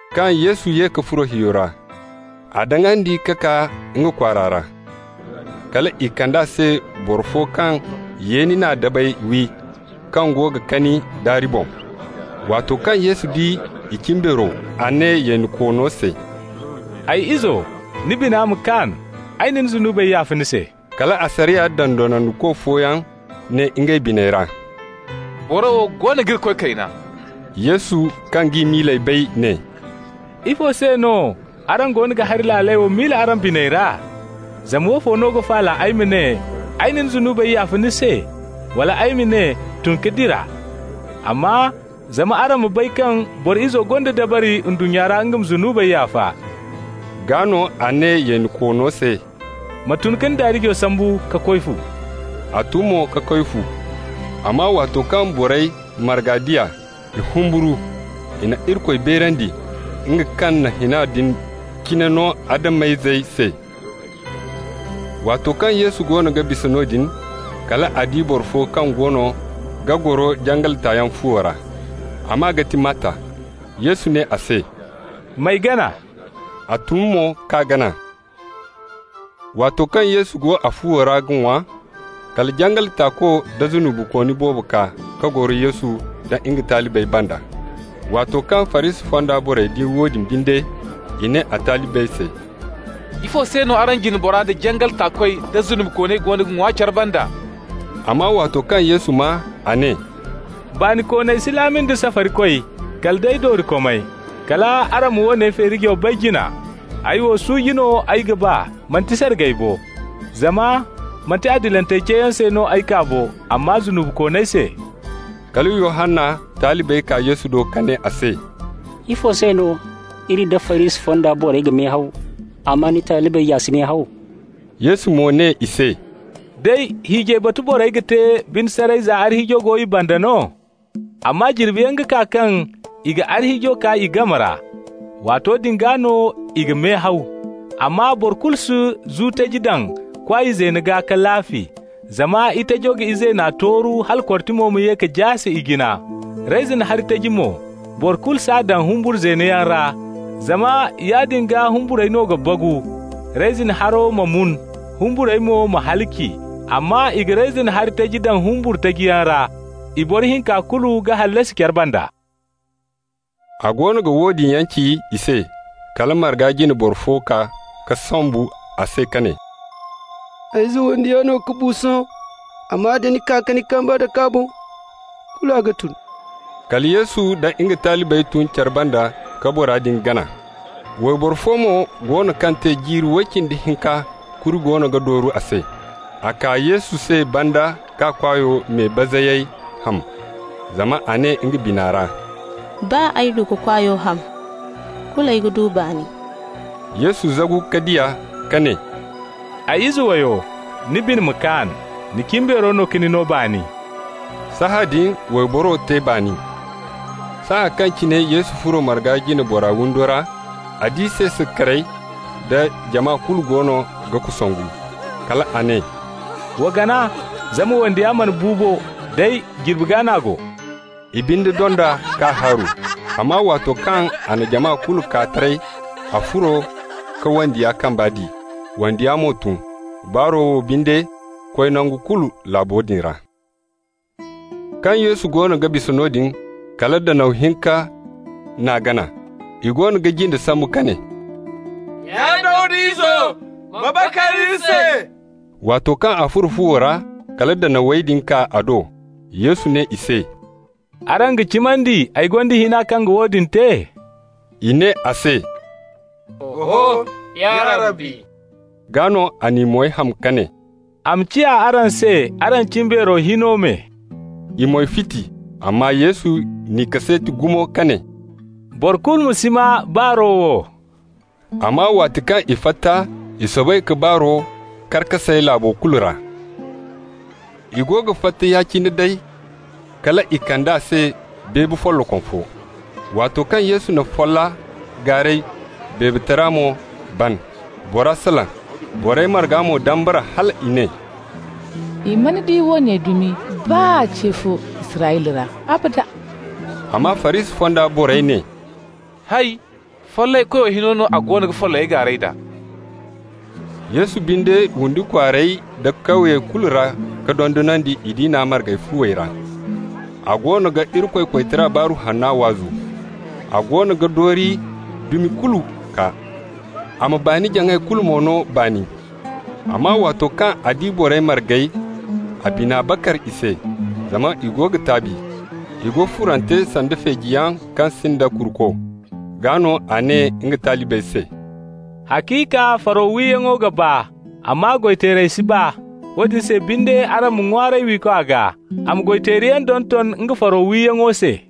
Kaŋ Yesu ye ka furo hiyo ra, a daŋandi ka kaa nga kwaara ra. Kal i kand'a se boro fo kaŋ yeeni na dabey wi, kaŋ go ga kani daari boŋ. Waato kaŋ Yesu di i cimbeero, a ne yeenikoono se: «Ay izo, ni bina ma kaan. Ay na ni zunubey yaafa ni se.» Kala asariya dondonandiko fooyaŋ ne ngey biney ra: «Boro wo goono ga Irikoy kayna.» Yesu kaŋ g'i miiley bay, ne: «Ifo se no araŋ goono ga hari laaley wo miila araŋ biney ra? Zama woofo no ga faala, ay ma ne: ‹Ay na ni zunubey yaafa ni se?› wala ay ma ne: ‹Tun ka dira?› Amma zama araŋ ma bay kaŋ Boro Izo gonda dabari ndunnya ra nga ma zunubey yaafa,» (gaa no a ne yeenikoono se): «Ma tun ka ni daarijo sambu ka koy fu.» A tun mo ka koy fu. Amma waato kaŋ borey marga di a, i humburu. I na Irikoy beerandi, nga kaŋ na hina din cine no Adam-izey se. Waato kaŋ Yesu goono ga bisa noodin, kal a di boro fo kaŋ goono ga goro jangal taayaŋ fuwo ra. A maa ga ti Matta. Yesu ne a se: «M'ay gana.» A tun mo k'a gana. Waato kaŋ Yesu go a fuwo ra ga ŋwa, kala jangal taako da zunubikooni boobo kaa ka goro Yesu nda nga talibey banda. Waato kaŋ Farisi fonda borey di woodin binde, i ne a talibey se: «Ifo se no araŋ jina bora, da jangal taakoy, da zunubikooney goono ga ŋwa care banda?» Amma waato kaŋ Yesu maa, a ne: «Baanikooney si laami nda safarikoy, kala day doorikomey. Kal araŋ ma woone feerijo bay jina: ‹Ay wo, suuji no ay ga ba, manti sargay bo.› Zama manti adilantey ceeyaŋ se no ay kaa bo, amma zunubikooney se.» Kala Yohanna talibey kaa Yesu do ka ne a se: «Ifo se no iri nda Farisi fonda borey ga mehaw, amma ni talibey ya si mehaw?» Yesu mo ne i se: «Day, hiijay batu borey ga te bine saray za arhiijo go i banda no? Amma jirbiyaŋ ga kaa kaŋ i ga arhiijo kaa i game ra. Waato din gaa no i ga mehaw. Amma boro kulu si zu taji daŋ kwaay zeeno gaa ka laafi, zama itajo ga izeena tooru hala kortimo ma ye ka jaase ijina. Reyzin hari taji mo, boro kulu s'a daŋ humbur zeeno yaŋ ra, zama yaadin gaa humburey no ga bagu, reyzin hari ma mun, humburey mo ma halaci. Amma i ga reyzin hari taji daŋ humbur taji yaŋ ra, i boro hinka kulu ga hallasi care banda.» A goono ga woodin yaŋ ci i se, kala marga jine boro fo kaa ka sombu a se ka ne: «Ay ize wandiya no ka bu sohõ, amma da ni kaa ka ni kambe dake a boŋ, kulu a ga tun.» Kala Yesu da nga talibey tun care banda ka bora din gana. Wayboro fo mo go no kaŋ te jiiri way cindi hinka kuri goono ga dooru a se. A kaa Yesu se banda k'a kwaayo me bazayey ham. Zama a ne nga bina ra: «Baa ay du k'a kwaayo ham, kulu ay ga du baani.» Yesu zagu ka di a, ka ne: «Ay ize wayo, ni bine ma kaan. Ni cimbeero no ka ni no baani.» Sahãadin wayboro te baani. Saaya kaŋ cine Yesu furo marga jine bora windo ra, a di seese karey da jama kulu goono ga kosongu. Kal a ne: «Wa gana, zama wandiya mana bu bo, day jirbi gaa n'a go.» I binde dond'a k'a haaru. Amma waato kaŋ a na jama kulu kaa taray, a furo ka wandiya kamba di, wandiya mo tun. Baaro wo binde koy nangu kulu laabo din ra. Kaŋ Yesu goono ga bisa noodin, kala danaw hinka n'a gana. I goono ga jinde sambu ka ne: «Ya Dawda izo, ma bakar iri se!» Waato kaŋ a furo fuwo ra, kala danawey din kaa a do. Yesu ne i se: «Araŋ ga cimandi ay gonda hina kaŋ ga woodin te?» I ne a se: «Oho, ya Rabbi.» Gaa no a n'i moy ham ka ne: «A ma ciya araŋ se araŋ cimbeero hino me.» I moy fiti. Amma Yesu n'i kaseeti gumo ka ne: «Boro kulu ma si maa baaro wo.» Amma waati kaŋ i fatta, i soobay ka baaro kar ka say laabo kulu ra. I go ga fatta ya-cine day, kal i kand'a se beebe follokom fo. Waato kaŋ Yesu na folla gaaray, beebetara mo ban. Bora salaŋ. Borey marga mo dambara, hal i ne: «I mana di woone dumi baa ce fo Israyla ra, abada.» Amma Farisi fonda borey ne: «Hay! Follayey koyo hino no a goono ga follayey gaaray d'a.» Yesu binde windi kwaarey da kawyey kulu ra ka dondonandi i diina marga fuwey ra. A goono ga Irikoy koytara baaru hanna waazu. A goono ga doori dumi kulu kaa, a ma baani-jaŋay kulu no baani. Amma waato kaŋ a di borey margey, a bina bakar i se, zama i go ga taabi, i go furante sanda feejiyaŋ kaŋ sinda kuruko. Gaa no a ne nga talibey se: «Haciika faro wiyaŋo ga baa, amma goy-teerey si baa. Woodin se binde araŋ ma ŋwaaray wiikwa gaa, a ma goy-teeriyaŋ donton nga faro wiyaŋo se.»